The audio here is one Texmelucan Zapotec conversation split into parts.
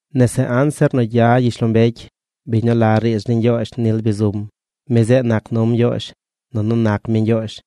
Nese anzir nu gya gyishlombecy, biñ nu la riidz ni Ñgyoozh nil bi zum. Mi zeꞌ nac num Ñgyoozh, nunu nac mi Ñgyoozh.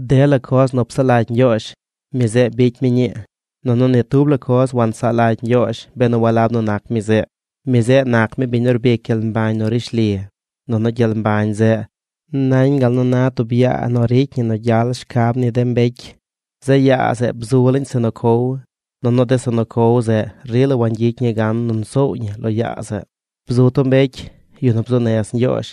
Dela coz nu psaꞌ lagy Ñgyoozh, mi zeꞌ bicy mi ñii. Nunu ni tub la coz wansaꞌ lagy Ñgyoozh benu walab nu nac mi zeꞌ. Mi zeꞌ nac mi biñ nu rbic gyel mbañ nu rishli. Nunu gyel mbañ zeꞌ nañ gal nu na tub yaa nu ricy ñi nu gyal shcab ni de mbecy. Zeꞌ yaa zeꞌ bzu laañ zeꞌ nu cow, nunu de zeꞌ nu cow zeꞌ rila wangyicy ñi gan nu nsoow ñi lo yaa zeꞌ. Bzu tub mbecy, yu nu bzuu nez Ñgyoozh.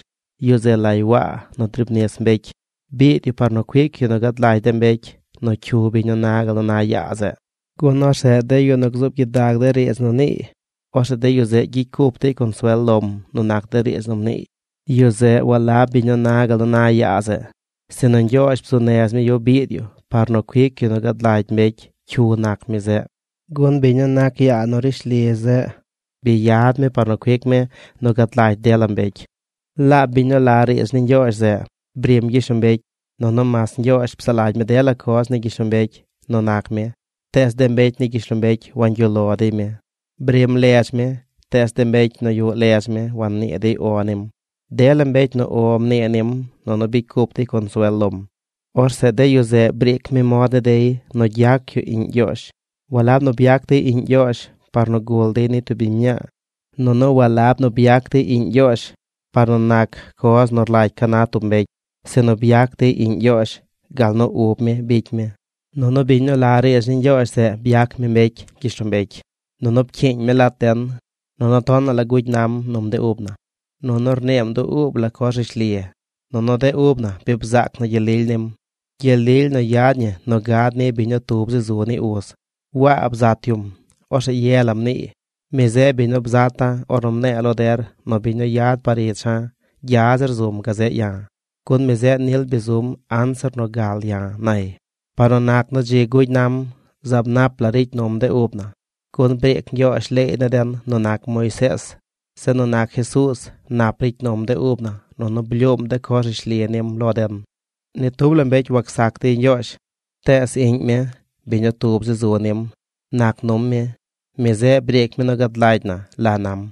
Yu zeꞌ lay Waa nu driib nis mbecy. Biid yu par nu cuic yu nu gad lagy de mbecy nu cyu biñ nu na gal nu na yaa zeꞌ, gun orzeꞌ de yu nu gzuub gyidag de riidz nu niiy, orzeꞌ de yu zeꞌ gyicy cup dey consuel lom nu nac de riidz nu mniiy. Yu zeꞌ walab biñ nu na gal nu na yaa zeꞌ, sinu Ñgyoozh bzuu nez mi yu biid yu par nu cuic yu nu gad lagy mbecy cyu nac mi zeꞌ. Gun biñ nu nac yaa nu rishli zeꞌ bi yad mi par nu cuic mi nu gad lagy dela mbecy. Laab biñ nu la riidz ni Ñgyoozh zeꞌ brim gyishlombecy. Nunu mas Ñgyoozh psaꞌ lagy mi dela coz ni gyishlombecy nu nac mi, tees de mbecy ni gyishlombecy wangyuꞌ lo dey mi. Brim ledz mi tees de mbecy nu yuꞌ ledz mi wannii dey “O” nim. Dela mbecy nu “O” mnii nim nunu bicy cup dey consuel lom, orzeꞌ de yu zeꞌ briic mi mod ni dey nu gyac yu iꞌñ Ñgyoozh. Walab nu byac dey iꞌñ Ñgyoozh par nu gul dey ni tub biñ mñaa, nunu walab nu byac dey iꞌñ Ñgyoozh par nu nac coz nu rlagy ca na tub mbecy, sinu byac dey iꞌñ Ñgyoozh gal nu ub mi bicy mi. Nunu biñ nu la riidz ni Ñgyoozh zeꞌ byac mi mbecy gyishlombecy, nunu pcyiiñ mi lat den. Nunu tonaꞌ la gugy nam num de ub na. Nunu rniim dub ub la coz rishli. Nunu de ub na bi bzaac na gyel lily nim, gyel lily nu yad ñi nu gad ni biñ nu tub zi zu ni uz. Waa bzat yum. Orzeꞌ ye la mniiy: ―Mi zeꞌ biñ nu bzata̱ ornu mne̱e̱ lo der nu biñ nu yad par icha̱ gya zir zum gazeꞌ ya̱, gun mi zeꞌ nil bi zum anzir nu gal ya̱ ―nay. Par nu nac nu dzi gugy nam, zaab nap la ricy num de ub na. Gun briic Ñgyoozh leey ni den nu nac Moisees. Zeꞌ nu nac Jesuuz, nap ricy num de ub na nunu blyuum de coz rishli nim lo den. Ni tub la mbecy wacsac dey Ñgyoozh. Tees iꞌñ mi, biñ nu tub zi zu nim, nac num mi. Mi zeꞌ briic mi nu gad lagy na la nam.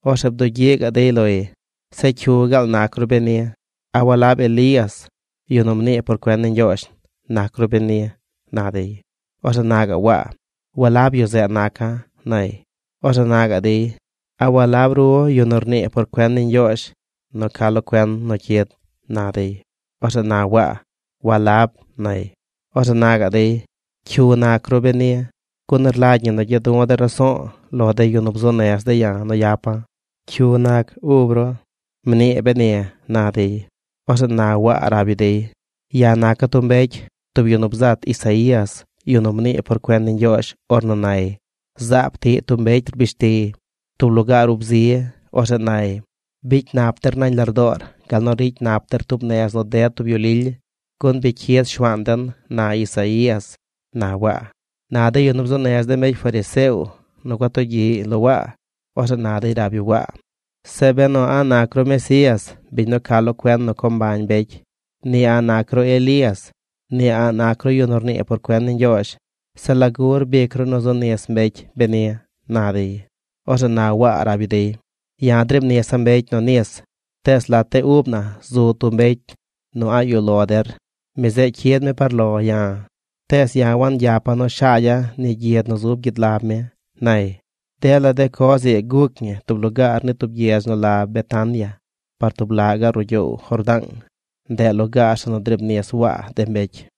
Orzeꞌ bdugyiꞌ gaꞌ dey loy: ―¿Zeꞌ cyu gaal nac ru beni? ¿A walab Elías, yu nu mnii por cuen ni Ñgyoozh, nac ru beni? ―na dey. Orzeꞌ na gaꞌ Waa: ―Walab yu zeꞌ naca̱ ―nay. Orzeꞌ na gaꞌ dey: ―¿A walab ru yu nu rnii por cuen ni Ñgyoozh nu ca lo cuen nu cyid? ―na dey. Orzeꞌ na Waa: ―Walab ―nay. Orzeꞌ na gaꞌ dey: ―¿Cyu nac ru beni? Gun rlagy ñi nu gya du̱ de̱ raso̱o̱ lo deyu nu bzuu nez de̱ ya̱ nu yapa̱. ¿Cyu nac ub ru? Mnii beni ―na dey. Orzeꞌ na Waa rab yu dey: ―Ya̱ naca̱ tub mbecy, tub yu nu bzat Isaías, yu nu mnii por cuen ni Ñgyoozh ornu nay: “Zaab tiꞌ tub mbecy rbish tiy tub lugaar ub zi. Orzeꞌ nay: Bicy nap der nañ lardoor gal nu ricy nap der tub nez nu ded tub yu lily, gun bi cyid Shuaan den”, na Isaías ―na Waa. Na de yu nu bzuu nez de mbecy fariseo nu gua tugyiꞌy lo Waa, orzeꞌ na dey rab yu Waa: ―Zeꞌ benu a̱ꞌ nac ru Mesías, biñ nu ca lo cuen nu co mbañ mbecy, ni a̱ꞌ nac ru Elías, ni a̱ꞌ nac ru yu nu rnii por cuen ni Ñgyoozh, zeꞌ ¿lagu rbic ru nu zu nis mbecy beni? ―na dey. Orzeꞌ na Waa rab yu dey: ―Ya̱ driib nisa̱ mbecy nu nis, tees lat de ub na zu tub mbecy nu a̱ꞌ yuꞌ lo der. Mi zeꞌ cyid mi par lo ya̱, tees ya̱ wangyapa̱ nu shaagya̱ ni gyid nu zub gyid lab mi ―nay. Dela de coz ii guc ñi tub lugaar ni tub gyedz nu la Betania, par tub laꞌ gaꞌ ruꞌ gyoow Jordaang. Ndeꞌ lugaar zeꞌ nu driib nis Waa de mbecy.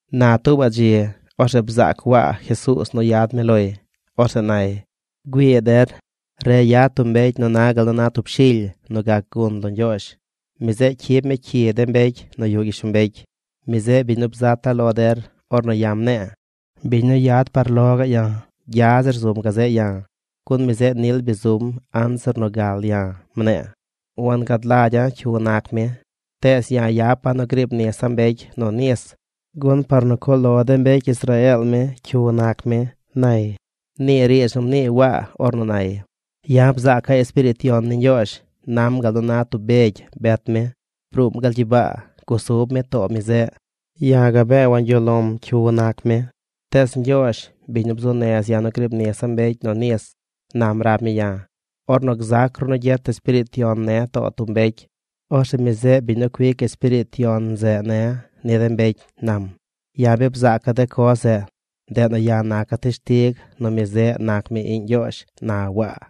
Na tuubaꞌ dzi orzeꞌ bzaac Waa Jesuuz nu yad mi loy. Orzeꞌ nay: ―Güii der, re yad tub mbecy nu na gal nu na tub shily nu gac gun lo Ñgyoozh. Mi zeꞌ cyib mi cyi de mbecy nu yuꞌ gyishlombecy. Mi zeꞌ biñ nu bzata̱ lo der ornu ya̱ mne̱e̱: “Biñ nu yad par ich ya̱, gya zir zum gazeꞌ ya̱, gun mi zeꞌ nil bi zum anzir nu gal ya̱”, mne̱e̱. Wangad lagya̱ cyu nac mi, tees ya̱ yapa̱ nu griib nisa̱ mbecy nu nis gun par nu cuꞌ lo de mbecy Israeel mi cyu nac mi ―nay. Nii riidz nu mnii Waa ornu nay: ―Ya̱ bzaaca̱ Espiriit Yon ni Ñgyoozh nam gal nu na tub begy bet mi. Bruum gal gyibaa. Gusub mi too mi zeꞌ. Ya̱ gabee wangyuꞌ lo̱m cyu nac mi. Tees Ñgyoozh, biñ nu bzuu nez ya̱ nu griib nisa̱ mbecy nu nis, nam rab mi ya̱: “Ornu gzac ru nu gyet Espiriit Yon ne̱ too tub mbecy, orzeꞌ mi zeꞌ biñ nu cuic Espiriit Yon zeꞌ ne̱ ni de mbecy”, nam. Ya̱ bi bzaaca̱ de coz zeꞌ. Ndeꞌ nu ya̱ naca̱ teshtig nu mi zeꞌ nac mi iꞌñ Ñgyoozh ―na Waa.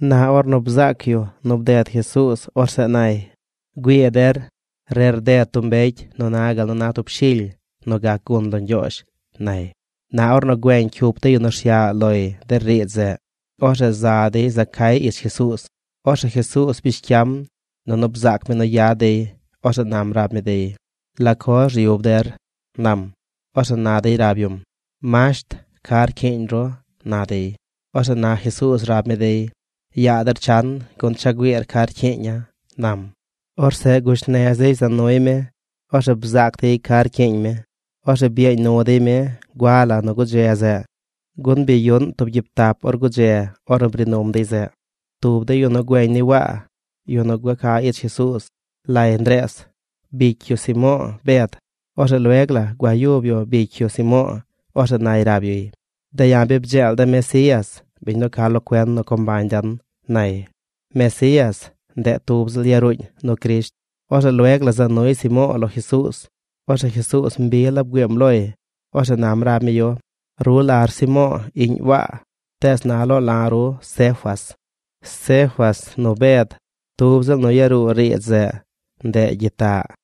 Na ornu bzaac yu nu bded Jesuuz, orzeꞌ nay: ―Güii der. Re rded tub mbecy nu na gal na tub shily nu gac gun lo Ñgyoozh ―nay. Na ornu güeñ cyup de yu nu rsyaꞌ loy de riidz zeꞌ, orzeꞌ za dey za cay ich Jesuuz. Orzeꞌ Jesuuz bish cyam, nunu bzaac mi nu yad dey. Orzeꞌ nam rab mi dey: ―¿La coz ryub der? ―nam. Orzeꞌ na dey rab yum: ―Masht, ¿ca rcyiiñ ru? ―na dey. Orzeꞌ na Jesuuz rab mi dey: ―Yaa der chan gun cha güiir ca rcyiiña̱ ―nam. Orzeꞌ gush nez dey za nuy mi. Orzeꞌ bzaac dey ca rcyiiñ mi. Orzeꞌ byeeñ nu dey mi gua la nu gudze zeꞌ, gun bi yuꞌn tub gyiib tap or gudze ornu bri num dey zeꞌ. Tub de yu nu güeñ ni Waa, yu nu gua ca ich Jesuuz, lay Ndrees bicy yu Simo̱o̱ Bed. Orzeꞌ lueg la gua yub yu bicy yu Simo̱o̱. Orzeꞌ nay rab yuy: ―De̱ ya̱ bi bdzeel de̱ Mesías, bin nu ca lo cuen nu co mbañ den ―nay. (Mesías, ndeꞌ tub ziꞌl yaruuñ nu Crisht.) Orzeꞌ lueg la za nuy Simo̱o̱ lo Jesuuz. Orzeꞌ Jesuuz mbi la bgüiim loy. Orzeꞌ nam rab mi yu: ―Ru lar Simo̱o̱ iꞌñ Waa. Tees na loo la̱ ru Cefas. (Cefas nu Bed tub ziꞌl nu yaruu riidz zeꞌ. Ndeꞌ gyitaꞌ.)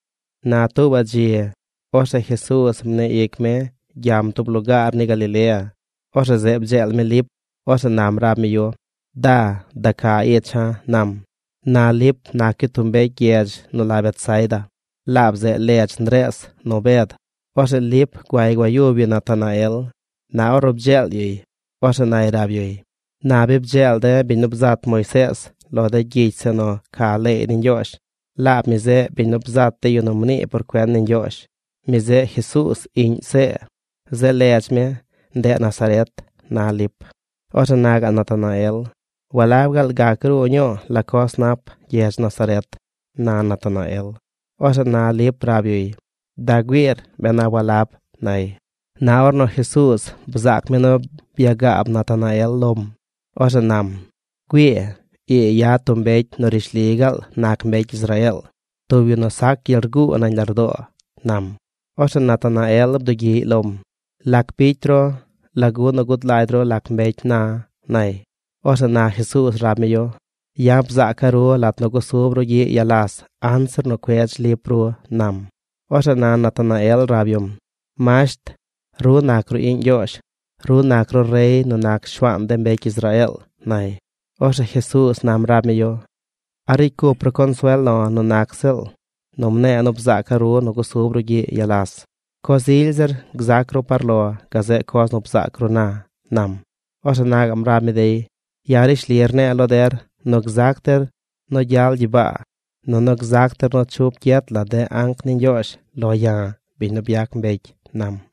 Na tuubaꞌ dzi, orzeꞌ Jesuuz mnii ic mi gyam tub lugaar ni Galilea. Orzeꞌ zeꞌ bdzeel mi Lip. Orzeꞌ nam rab mi yu: ―Da, da ca icha̱ ―nam. Na Lip nac yu tub mbecy gyedz nu la Betsaida. Laab zeꞌ ledz Ndrees nu Bed. Orzeꞌ Lip guay gua yub yu Natanael. Na ornu bdzeel yuy, orzeꞌ nay rab yuy: ―Na bi bdzeel de̱ biñ nu bzat Moisees lo de gyicy zeꞌ nu ca leey ni Ñgyoozh. Laab mi zeꞌ biñ nu bzat de yu nu mnii por cuen ni Ñgyoozh. Mi zeꞌ Jesuuz iꞌñ See. Zeꞌ ledz mi, ndeꞌ Nazaret ―na Lip. Orzeꞌ na gaꞌ Natanael: ―¿Walab gaal gac gruu ñuu la coz nap gyedz Nazaret? ―na Natanael. Orzeꞌ na Lip rab yuy: ―Da güiir ben a walab ―nay. Na ornu Jesuuz bzaac mi nu byagaab Natanael lom, Orzeꞌ nam: ―Güii, ii yad tub mbecy nu rishli gaal nac mbecy Israeel, tub yu nu sac gyel rguu nañ lardoo ―nam. Orzeꞌ Natanael bdugyiꞌy lom: ―¿Lac bicy ru? ¿Lagu nu gud lagy ru lac mbecy na̱? ―nay. Orzeꞌ na Jesuuz rab mi yu: ―Ya̱ bzaaca̱ ru lat nu gusub ru gyiꞌ yalas anzir nu cuedz Lip ru ―nam. Orzeꞌ na Natanael rab yum: ―Masht, ru nac ru iꞌñ Ñgyoozh. Ru nac ru rey nu nac Shuaan de mbecy Israeel ―nay. Orzeꞌ Jesuuz nam rab mi yu: ―¿A ricy cup ru consuel lo̱ nu nac ziꞌl nu mne̱e̱ nu bzaaca̱ ru nu gusub ru gyiꞌ yalas? Coz ily zir gzac ru par lo gazeꞌ coz nu bzaac ru na ―nam. Orzeꞌ na gaꞌm rab mi dey: ―Ya̱ rishli rne̱e̱ lo der nu gzac der nu gyal gyibaa, nunu gzac der nu chup gyet la de anc ni Ñgyoozh lo̱ ya̱, biñ nu byac mbecy ―nam.